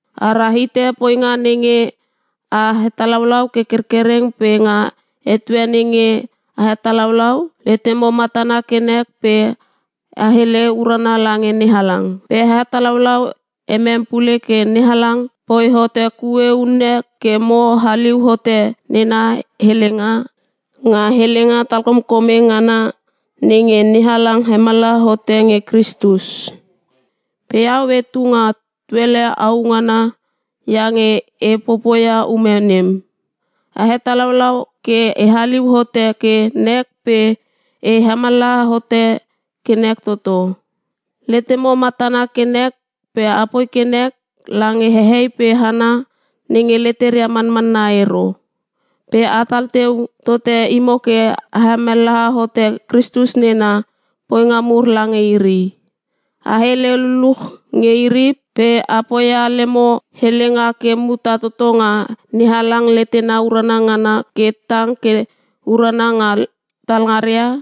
A rahite poinga nenge a hetalaulau ke kerkereng pe nga etue nenge a hetalaulau letemo matana ke nek pe a hele urana lange NeHalang. Pe a hetalaulau emem pule ke NeHalang poi hote kue unne ke mo haliu hote nena helenga, nga helenga talkomkome ngana nenge NeHalang hemallaha hote nge Kristus. Pe iau etu nga tuele au ngana iange e popoia ume nem. A hetalaulau ke e haliu hote ke nek pe e hemallaha hote ke nek toto. Letemo matana ke nek pe apoi ke nek lange hehei pe hana nenge leteria manmanna ero. Pe atal teu tote imo ke a hemallaha hote Kristus nena poinga mur lange iri. A hele luluch nge iri pe a poia lemo helenga ke muta toto nga NeHalang letena urana ngana ke tang ke urana nga talngaria.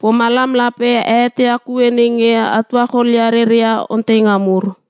Pomalam lape a eteia kue nenge a tuacholia reria onteinga mur.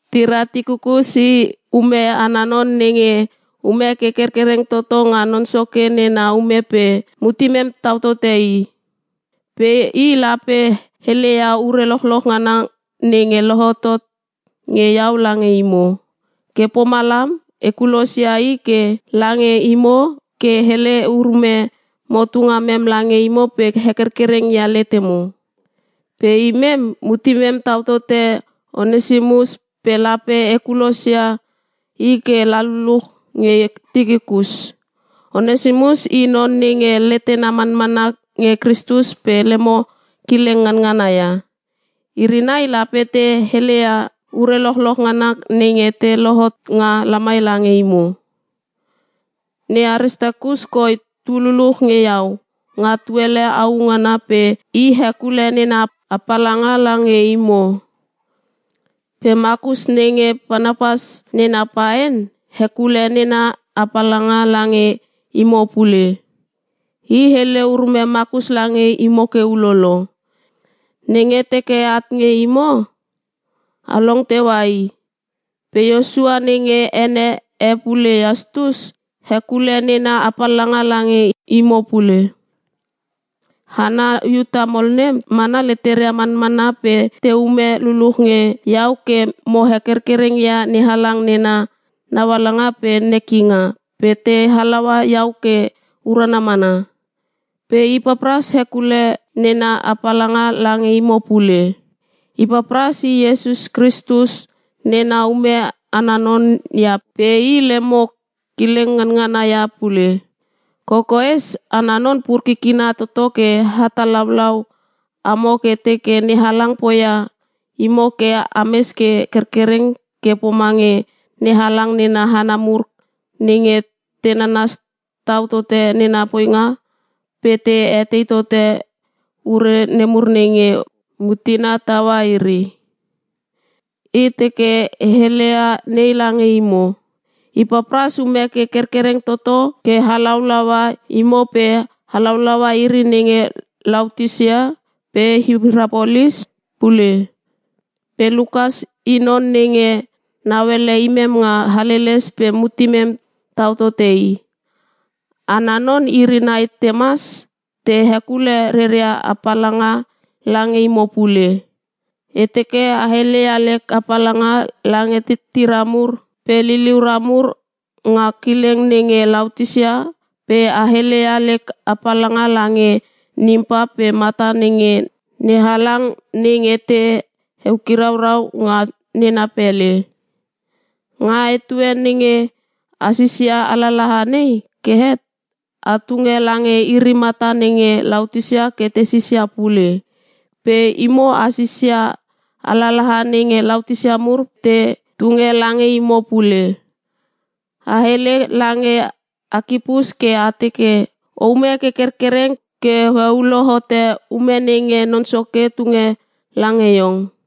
Tira Tikikus i ume ana non nenge ume ke kerkereng toto nga Non Soke nena ume pe mutemem tau tote i. Pe i lape heleia ure lochloch ngana nenge lohotot nge iau lange imo. Ke pomalam e kulosia i ke lange imo ke hele urume motu ngamem lange imo pe hekerkereng ia letemo. Pe imem, mutemem tau tote Onesimus pe lape e kulosia i ke la luluch nge Tikikus. Onesimus i non nenge letena manmanna nge Kristus pe lemo kileng nganngana ia. Iri nai lape te heleia ure lochloch ngana nenge te lohot nga lamai lange imo. Ne Aristakus koi tu luluch nge iau nga tuele au ngana pe i hekule nena apalanga lange imo. Pe Makus nenge Parnapas nena paen, hekule nena apalanga lange imo pule. (E hele urume Makus lange imo ke ulolo: Nenge teke at nge imo, a long teua i.) Pe Iosua nenge ene e pule Iastus, hekule nena apalanga lange imo pule. Hana Iuta mol nem mana leteria manmanna, pe teume luluch nge iau ke mo hekerkereng ia NeHalang nena naualanga pe nekinga, pe te halaua iau ke urana mana. Pe Ipapras hekule nena apalanga lange imo pule. Ipapras i Iesus Kristus nena ume ana non ia pe i lemo kileng nganangana ia pule. Kokoes ana non pur kikina toto ke hetalaulau amo ke teke NeHalang poia imo ke ames ke kerkereng ke pomange NeHalang nena hana mur nenge te nanas tau tote nena poinga pe te etei tote ure nemur nenge mutena taua iri. E teke e heleia nei lange imo. Ipapras ume ke kerkereng toto ke halaulaua imo pe halaulaua iri nenge Laotisia pe Hirapolis pule. Pe Lukas i non nenge nauele imem nga haleles pe mutemem tau tote i. Ana non iri nai Temas te hekule reria apalanga lange imo pule. E teke a heleia lek apalanga lange titira mur pe liliura mur nga kileng nenge Laotisia pe a heleia lek apalanga lange Nimpa pe mata nenge NeHalang nenge te hekiraurau nga nena pele. Nga etue nenge a sisia alalaha nei ke het, a tunge lange iri mata nenge Laotisia ke te sisia pule. Pe imo a sisia alalaha nenge Laotisia mur te tunge lange imo pule. A hele lange Akipus ke a teke, “O ume ke kerkereng ke o heulo hote ume nenge Non Soke tunge lange iong.”